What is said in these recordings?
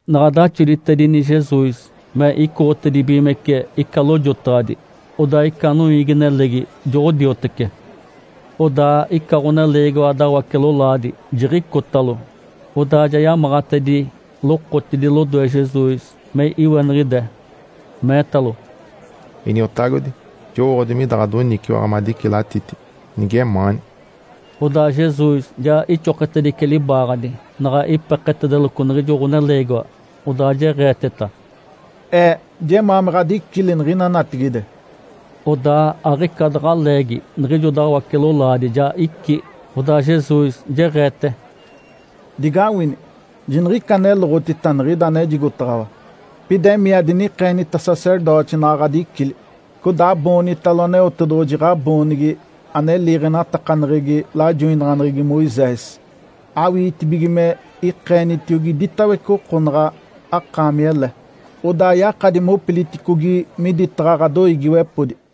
Naɡ̶a daxoditedini Jesus me icoɡ̶otedibigimece ica lojotaɡ̶adi, odaa ica noiigi-nelegi joɡ̶odiotece. Odaa ica ɡ̶oneleegiwa dawace-lolaadi jiɡ̶icotalo, odaa ja yamaɡ̶atedi lokotidi lodoe Jesus me iweniɡ̶ide, meetalo, “Iniotagodi, jowooɡ̶odi mida ɡ̶adoniciwaɡ̶a madicilatiti, nigemaani.” Odaa Jesus ja ixoketedice libaaɡ̶adi, naɡ̶a ipeketedeloco niɡ̶ijo ɡ̶oneleegiwa, odaa jeɡ̶eeteta, “Ee jemaa me ɡ̶adicili niɡ̶ina natigide!” Odaa aɡ̶ica daɡ̶a leegi niɡ̶ijo dawace-lolaadi ja icí. Odaa Jesus jeɡ̶eete, “Digawini, jiniɡ̶ica aneloɡ̶otita niɡ̶ida anejigotaɡ̶awa. Pida emii, adinikeenita sacerdoti naɡ̶a ɡ̶adicili. Codaa aboonitalo Aneotedoɡ̶oji ɡ̶aboonigi ane liiɡ̶enatakaneɡ̶egi lajoinaɡ̶aneɡ̶egi Moisés, awiitibige me ikeenitiogi iditawece oko naɡ̶a akaami ele. Odaa yakadi mopiliticogi miditaɡ̶a ɡ̶adoiigiwepodi.”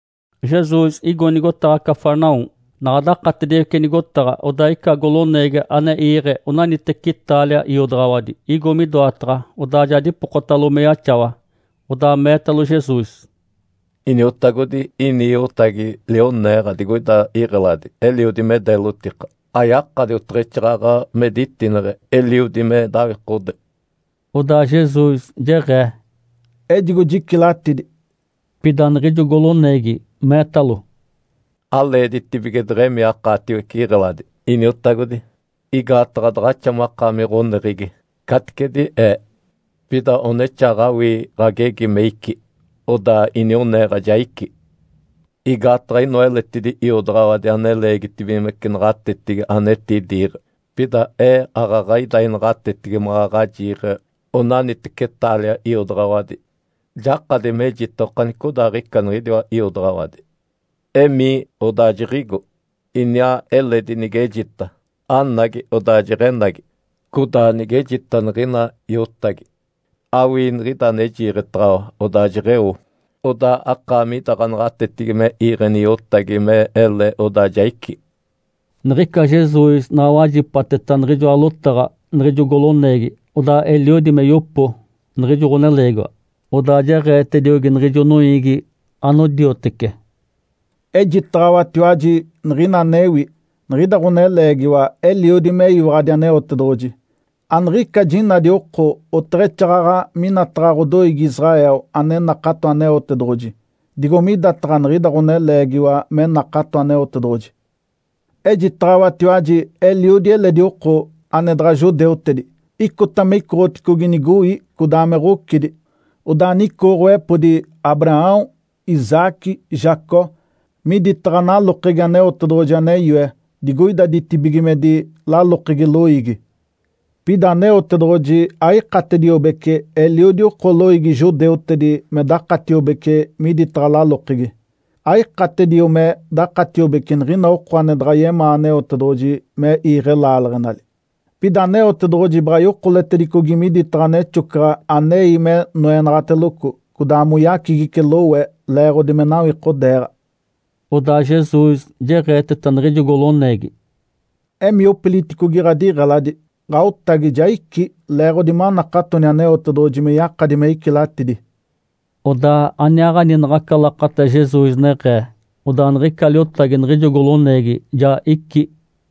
Jesus igo nigotaɡ̶a Cafarnaum. Naɡ̶a dakatediwece nigotaɡ̶a, odaa ica goloneegi ane iiɡ̶e onaniteci taalia iodaɡ̶awadi, igo midoataɡ̶a, odaa ja dipokotalo me yaxawa. Odaa meetalo Jesus, “Iniotagodi, ini iotagi lioneeɡ̶a digoida iɡ̶eladi eliodi me deelotika. Ayakadi oteɡ̶exaaɡ̶aɡ̶a me ditineɡ̶e, eliodi me dawikode.” Odaa Jesus jeɡ̶ee, “Ejigo jicilatidi.” Pida niɡ̶ijo goloneegi meetalo, “Aleeditibige deɡ̶emii akaatiwece iɡ̶eladi, Iniotagodi. Igaataɡ̶a daɡ̶axa makaami ɡ̶oneɡ̶egi, caticedi ee. Pida onexaaɡ̶awii ɡ̶agegi me icí, odaa inioneeɡ̶a ja icí. Igaataɡ̶a inoa eletidi iodaɡ̶awadi ane leegitibigimece naɡ̶atetigi ane etidiiɡ̶e. Pida ee aaɡ̶aɡ̶a ida inaɡ̶atetigi maɡ̶aɡ̶a jiiɡ̶e onaniteci taalia iodaɡ̶awadi. Jakadi mejita okanicodaaɡ̶ica niɡ̶idiwa iodaɡ̶awadi, ‘Emii!’ Odaa jiɡ̶igo. Iniaa eledi nigejita, ‘Anagi!’ Odaa jeɡ̶enagi. Codaa nigejita niɡ̶ina iotagi, ‘Awii niɡ̶ida ane jiiɡ̶etaɡ̶awa!’ Odaa jeɡ̶eo. Odaa akaami ida ɡ̶anaɡ̶atetigi me iiɡ̶eni iotagi me ele, odaa ja icí.” Niɡ̶ica Jesus naɡ̶a wajipateta niɡ̶ijoa lotaɡ̶a niɡ̶ijo goloneegi, odaa eliodi me yopo niɡ̶ijo ɡ̶oneleegiwa. Odaa jeɡ̶eetediogi niɡ̶ijo noiigi anodiotece, “Ejitaɡ̶awatiwaji niɡ̶ina anewi. Niɡ̶ida ɡ̶oneleegiwa eliodi meyiwaɡ̶adi Aneotedoɡ̶oji. Aniɡ̶ica jinadi oko oteɡ̶exaaɡ̶aɡ̶a minataɡ̶a ɡ̶odoiigi Israel ane nakato Aneotedoɡ̶oji, digo midataɡ̶a niɡ̶ida ɡ̶oneleegiwa me nakato Aneotedoɡ̶oji. Ejitaɡ̶awatiwaji eliodi eledi oko, ane daɡ̶a judeutedi, icota me icoɡ̶oticogi nigoi codaa me ɡ̶ocidi, odaa nicooɡ̶owepodi Abraão, Isaque, Jacó miditaɡ̶a nalokegi Aneotedoɡ̶oji ane yoe digoida ditibigimedi, lalokegi loiigi. Pida Aneotedoɡ̶oji aikatediobece eliodi oko loiigi judeutedi me dakatiobece miditaɡ̶a lalokegi. Aikatedio me dakatiobece niɡ̶ina oko ane daɡ̶a yemaa Aneotedoɡ̶oji me iiɡ̶e laaleɡ̶enali. Pida Aneotedoɡ̶oji baɡ̶a yokoletedicogi miditaɡ̶a nexocaɡ̶a anei me noenaɡ̶ateloco, codaa moyacigice lowe leeɡ̶odi me nawikodeeɡ̶a.” Odaa Jesus jeɡ̶eeteta niɡ̶ijo goloneegi, “Emii opiliticogi ɡ̶adiɡ̶eladi, ɡ̶aotagi ja icí leeɡ̶odi manakatoni Aneotedoɡ̶oji me yakadi me icilatidi.” Odaa aniaaɡ̶ani naɡ̶aca lakata Jesus neɡ̶ee, odaa niɡ̶ica liotagi niɡ̶ijo goloneegi ja icí.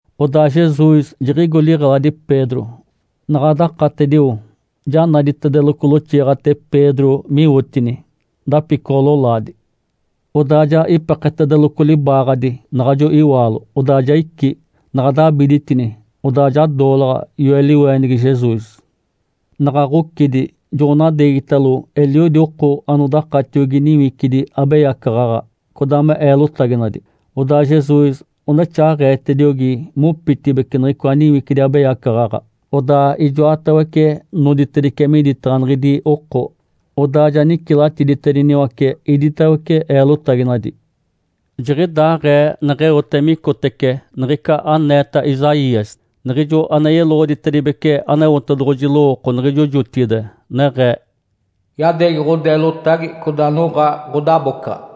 Odaa Jesus jiɡ̶igo liɡ̶eladi Pedro. Naɡ̶a dakatedio, ja naditedeloco loxiiɡ̶ate Pedro miwotini, dapicoɡ̶o-lolaadi. Odaa ja ipeketedeloco libaaɡ̶adi naɡ̶ajo iwaalo, odaa ja icí. Naɡ̶a dabiditini, odaa ja doolaɡ̶a yoe liweenigi Jesus. Naɡ̶a ɡ̶ocidi, joɡ̶onadeegitalo eliodi oko anodakatiogi niwicidi abeyacaɡ̶aɡ̶a, codaa me eelotaginadi. Odaa Jesus onexaaɡ̶eetediogi mopitibeci niɡ̶icoa niwicidi abeyacaɡ̶aɡ̶a, odaa ijoatawece noditedice miditaɡ̶a niɡ̶idi oko. Odaa ja nicilatiditediniwace iditawece eelotaginadi. Jiɡ̶idaaɡ̶ee neɡ̶eote micotece niɡ̶ica aneeta Isaías, niɡ̶ijo ane yeloɡ̶oditibece Aneotedoɡ̶oji lowooko niɡ̶ijo jotigide, neɡ̶ee, “Yadeegi ɡ̶odeelotagi, codaa noɡ̶a ɡ̶odabocaɡ̶a.”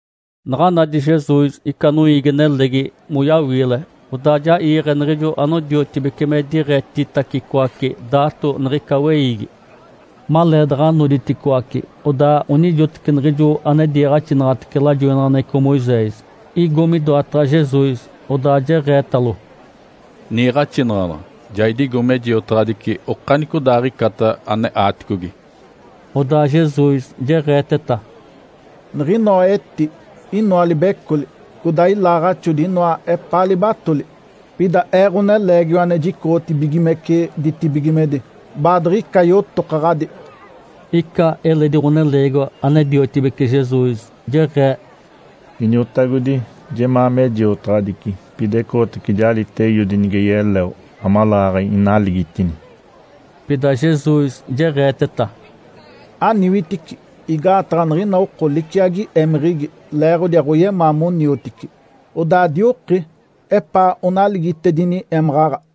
Naɡ̶a nadi Jesus ica noiigi-nelegi moyawiile, odaa ja iiɡ̶e niɡ̶ijo anodiotibece me diɡ̶etitacicoace daato niɡ̶ica weiigi. Maleedaɡ̶a noditicoaci, odaa onijoteci niɡ̶ijo ane diiɡ̶axinaɡ̶atece lajoinaɡ̶aneɡ̶eco Moisés igo midoataɡ̶a Jesus, odaa jeɡ̶eetalo, “Niiɡ̶axinaɡ̶anaɡ̶a, ja idigo me jiotaɡ̶adici okanicodaaɡ̶icata ane aaticogi.” Odaa Jesus jeɡ̶eeteta, “Niɡ̶inoa eti inoa libecoli, codaa ilaaɡ̶axodi inoa epaa libatoli. Pida Ee, Ǥoneleegiwa ane jicoɡ̶otibigimece ditibigimedi, baadiɡ̶ica yotokaɡ̶adi.” Ica eledi ɡ̶oneleegiwa ane diotibece Jesus jeɡ̶ee, “Iniotagodi, jemaa me jiotaɡ̶adici. Pida ecoɡ̶otace jalita eiodi nige yeleo amaleeɡ̶aɡ̶a inaligitini.” Pida Jesus jeɡ̶eeteta, “Aniwitici! Igaataɡ̶a niɡ̶ina oko liciagi émeɡ̶egi leeɡ̶odi aɡ̶oyemaa moniotici, odaa dioki epaa onaligitedini émaɡ̶aɡ̶a.”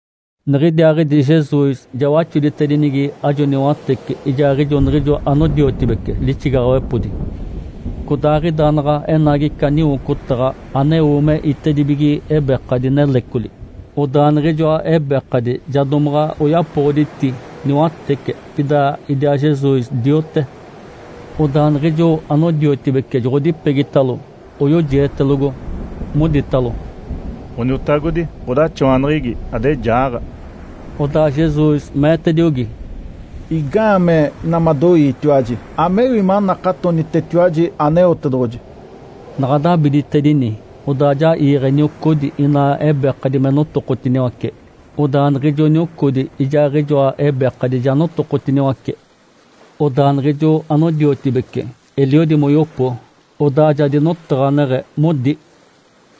Niɡ̶idiaaɡ̶idi Jesus ja waxoditedinigi ajo niwatece ijaaɡ̶ijo niɡ̶ijo anodiotibece lixigaɡ̶awepodi. Codaaɡ̶ida naɡ̶a enagi ica niwocotaɡ̶a aneo me itedibige ebekadi nelecoli. Odaa niɡ̶ijoa ebekadi ja domaɡ̶a oyapoɡ̶oditi niwatece. Pida idiaa Jesus diote. Odaa niɡ̶ijo anodiotibece joɡ̶odipegitalo, oyojietelogo, moditalo, “Ǥoniotagodi, ɡ̶odaxawaneɡ̶egi! Ade jaaɡ̶a!” Odaa Jesus meetediogi, “Igaamee ina madoiitiwaji? Amewi manakatonitetiwaji Aneotedoɡ̶oji.” Naɡ̶a dabiditedini, odaa ja iiɡ̶e niocodi inaa ebekadi me notokotiniwace. Odaa niɡ̶ijo niocodi ijaaɡ̶ijoa ebekadi ja notokotiniwace. Odaa niɡ̶ijo anodiotibece eliodi moyopo, odaa ja dinotaɡ̶aneɡ̶e modi,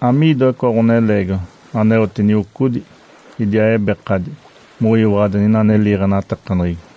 “Amiidoa icoa ɡ̶oneleegiwa? Aneote niocodi idiaa ebekadi moyiwaɡ̶adi niɡ̶ina ane liiɡ̶enatakaneɡ̶egi!”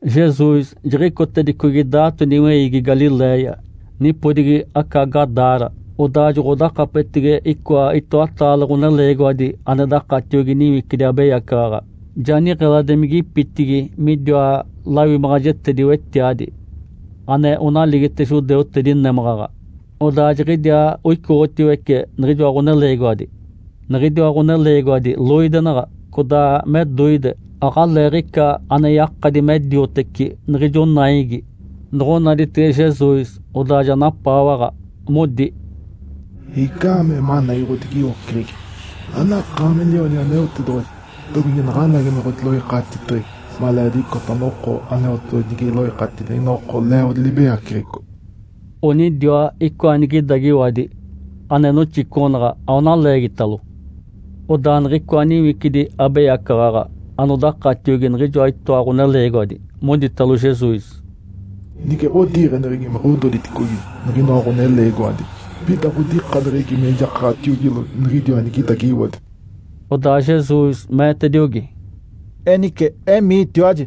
Jesus jiɡ̶icotedicogi daato niweiigi Galiléia, nipodigi aca Gadara. Odaa joɡ̶odakapetege icoa itoataale ɡ̶oneleegiwadi ane dakatiogi niwicidi abeyacaɡ̶aɡ̶a, ja niɡ̶eladimigipitigi midiwa lawimaɡ̶ajetedi-wetiadi, ane onaligite judeutedi némaɡ̶aɡ̶a. Odaa jiɡ̶idiaa oicoɡ̶otiwece niɡ̶ijoa ɡ̶oneleegiwadi. Niɡ̶idiwa ɡ̶oneleegiwadi loidenaɡ̶a, codaa me doide, aɡ̶aleeɡ̶ica ane yakadi me dioteci niɡ̶ijo naigi. Noɡ̶onaditege Jesus, odaa ja napaawaɡ̶a, modi, “Igaamee managi ɡ̶odigiwoceɡ̶egi, anakaami Lionigi Aneotedoɡ̶oji? Domige naɡ̶anagi me ɡ̶odiloikatiteɡ̶egi maleediɡ̶icota noko Aneotedoɡ̶oji nige iloikatidi niɡ̶ina oko leeɡ̶odi libeyaceɡ̶eco?” Onidiwa icoa nigidagiwadi ane noxicoɡ̶onaɡ̶a aona leegitalo. Odaa niɡ̶icoa niwicidi abeyacaɡ̶aɡ̶a anodakatiogi niɡ̶ijoa itoa ɡ̶oneleegiwadi moditalo Jesus, “Nige ɡ̶odiiɡ̶eneɡ̶egi me ɡ̶ododiticogi niɡ̶inoa ɡ̶oneleegiwadi, pida ɡ̶odikaneɡ̶egi me jakaɡ̶atiogilo niɡ̶idiwa nigidagiwadi.” Odaa Jesus meetediogi, “Enice emiitiwaji!”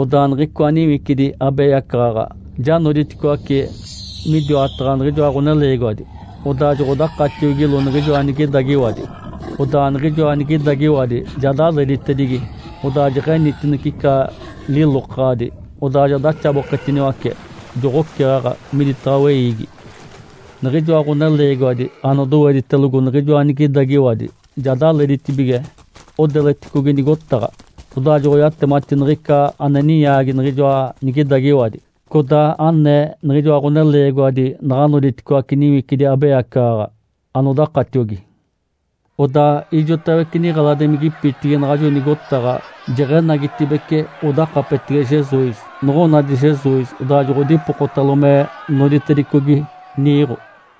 Odaa niɡ̶icoa niwicidi abeyacaɡ̶aɡ̶a ja noditicoaci midiwataɡ̶a niɡ̶ijoa ɡ̶oneleegiwadi, odaa joɡ̶odakatiogilo niɡ̶ijoa nigidagiwadi. Odaa niɡ̶ijoa nigidagiwadi ja daleditedigi, odaa jeɡ̶enitinece ica lilokaɡ̶adi, odaa ja daxaboketiniwace, joɡ̶oceɡ̶aɡ̶a miditaɡ̶a weiigi. Niɡ̶ijoa ɡ̶oneleegiwadi anodoweditelogo niɡ̶ijoa nigidagiwadi ja daleditibige odeleticogi nigotaɡ̶a, odaa joɡ̶oyatemati niɡ̶ica ane ninyaagi niɡ̶ijoa nigidagiwadi, codaa anee niɡ̶ijoa ɡ̶oneleegiwadi naɡ̶a noditicoaci niwicidi abeyacaɡ̶aɡ̶a anodakatiogi. Odaa ijotawece niɡ̶eladimigipitigi naɡ̶ajo nigotaɡ̶a jeɡ̶enagitibeci odakapetege Jesus. Noɡ̶onadi Jesus, odaa joɡ̶odipokotalo me noditedicogi niiɡ̶o.